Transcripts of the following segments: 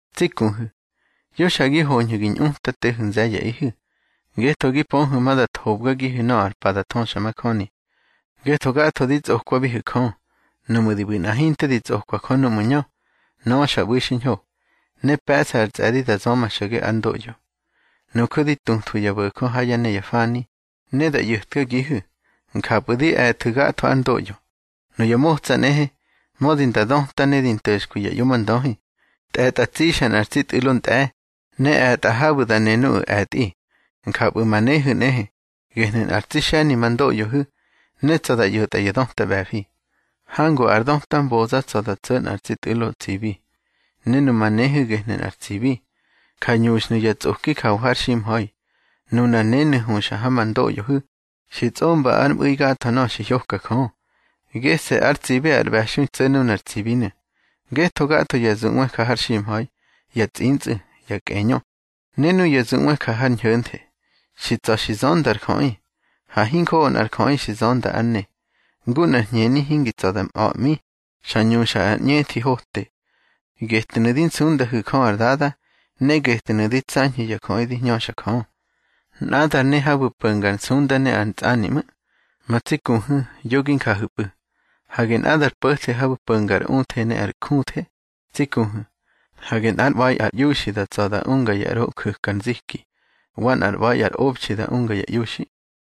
Tsi kuhu̱, yo xa gi hoñhu̱ gi ñꞌutatehu̱ nze̱ye̱ꞌihu̱, ngetho gi pöhu̱ ma da thobgagihu̱ nöꞌö ar pa da thöxamajöni. Ngetho gatho di tsꞌokwabihu̱ Jö. Nuꞌmu̱ di ꞌbu̱ nꞌa hinte tsꞌokwa Jö núꞌmu̱ ñö, nöꞌö xa ꞌbu̱i xiñho, ne pe̱ꞌsa ar tsꞌe̱di da zöma xo̱ge ár ndoꞌyo. Nuju̱ di tutwabihu̱ ya bo̱jö ha yá ne ya fani, ne da ꞌyo̱tkagihu̱. Njapꞌu̱ di e̱thu̱ gatho ár ndoꞌyo. Nuya motsa nꞌehe, mödi nda döta ne di nto̱xkwi ya ꞌyomndöhi, tꞌe̱tꞌa tsixa nꞌar tsi tꞌu̱lo ntꞌe̱, ne e̱tꞌa habu̱ da ne nuꞌu̱ e̱tꞌi. Njapꞌu̱ ma nehu̱ nꞌehe, gehnu̱ nꞌár tsi xe̱ni ma ndoꞌyohu̱, ne tsa̱ da ꞌyo̱tꞌa ya döta ꞌbe̱fi. Hangu ár döta ar mboza tsa̱ da tso̱ nꞌar tsi tꞌu̱lo tsibi. Ne numa nehu̱ gehnu̱ nꞌar tsibi. Ja ñuxhnu̱ ya tsꞌoki jawa har ximha̱i. Nunar nenu̱ huxa ha ma ndoꞌyohu̱, xi tsꞌomba ár mꞌu̱i gatho nöꞌö xi hyoka Jö. Gese̱ ár tsibi ar ꞌbe̱xui tso̱ nunar tsibinu̱. Ngetho gatho ya zuꞌwe ja har ximha̱i, ya tsꞌintsꞌu̱, ya kꞌeñö ne nuya zuꞌwe ja har ñho̱nthe, xi tsa̱ xi zönda ar jöꞌi. Ha hinjoꞌo nꞌar jöꞌi xi zönda ár ne. Ngu nꞌar hñeni hingi tsa̱ da mꞌa̱ꞌmi, xa ñuxa ar ꞌñethi hote. Getnu̱ di nsundahu̱ Jö ar Dada, ne getnu̱ di tsañhu̱ ya jöꞌi di hñöxa Jö. Nꞌadar ne habu̱ po̱nga ar nsunda ne ar ntsꞌani ꞌmu̱. Ma tsi kuhu̱, yo gi njahu̱pꞌu̱. Hage nꞌadar po̱the habu̱ po̱nga ar uthe ne ar júthe. Tsi kuhu̱, hage nꞌár ꞌba̱i ar iuxi tsa̱ da unga ya ꞌro nju̱ka ar nziki, wa nꞌár ꞌba̱i ar obxi da unga ya iuxi.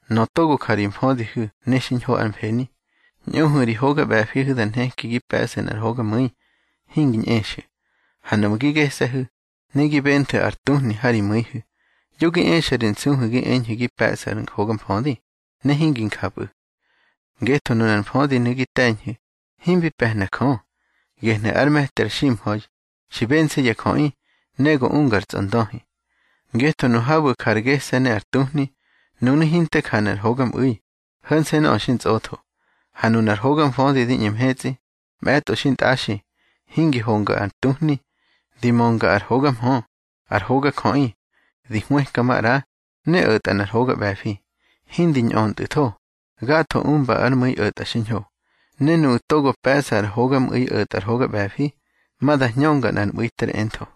Nöꞌö togo ja ri mfödihu̱ ne xiñho ár mfeni, ñꞌuhu̱ ri hoga ꞌbe̱fihu̱ da nheki gi pe̱ꞌsu̱ nꞌar hogamu̱i, hingi ñꞌexu̱. Ha nuꞌmu̱ gi gese̱hu̱, ne gi benthu̱ ar tuhni ha ri mu̱ihu̱, yo gi exa ri nsuhu̱ gi eñhu̱ gi pe̱ꞌsu̱ ar hoga mfödi, ne hingi njapꞌu̱. Ngetho nunar mfödinu̱ gi te̱ñhu̱, himbi pe̱hna Jö. Gehnu̱ ár me̱ti ar ximha̱i, xi bense̱ ya jöꞌi, ne go unga ar tsꞌondöhi. Ngetho nu habu̱ ja ar gese̱ ne ya tuhni, nunu̱ hinte janu̱ ar hogamꞌu̱i, ho̱nse̱ nöꞌö xi ntsꞌotho. Ha nunar hoga mfödi di ꞌñe mhetsꞌi, mꞌe̱tꞌo xintꞌaxi, hingi honga ar tuhni, di mönga ar hogamhö, ar hogajöꞌi. Di hwëka maꞌra, ne o̱tꞌa nꞌar hoga ꞌbe̱fi, hindi ñꞌöntꞌu̱tho, gatho umba ár mu̱i o̱tꞌa xiñho. Ne nuꞌu̱ togo pe̱ꞌsa ar hogamu̱i o̱tꞌa ar hoga ꞌbe̱fi, ma da hñönga nꞌar mꞌu̱i ter entho.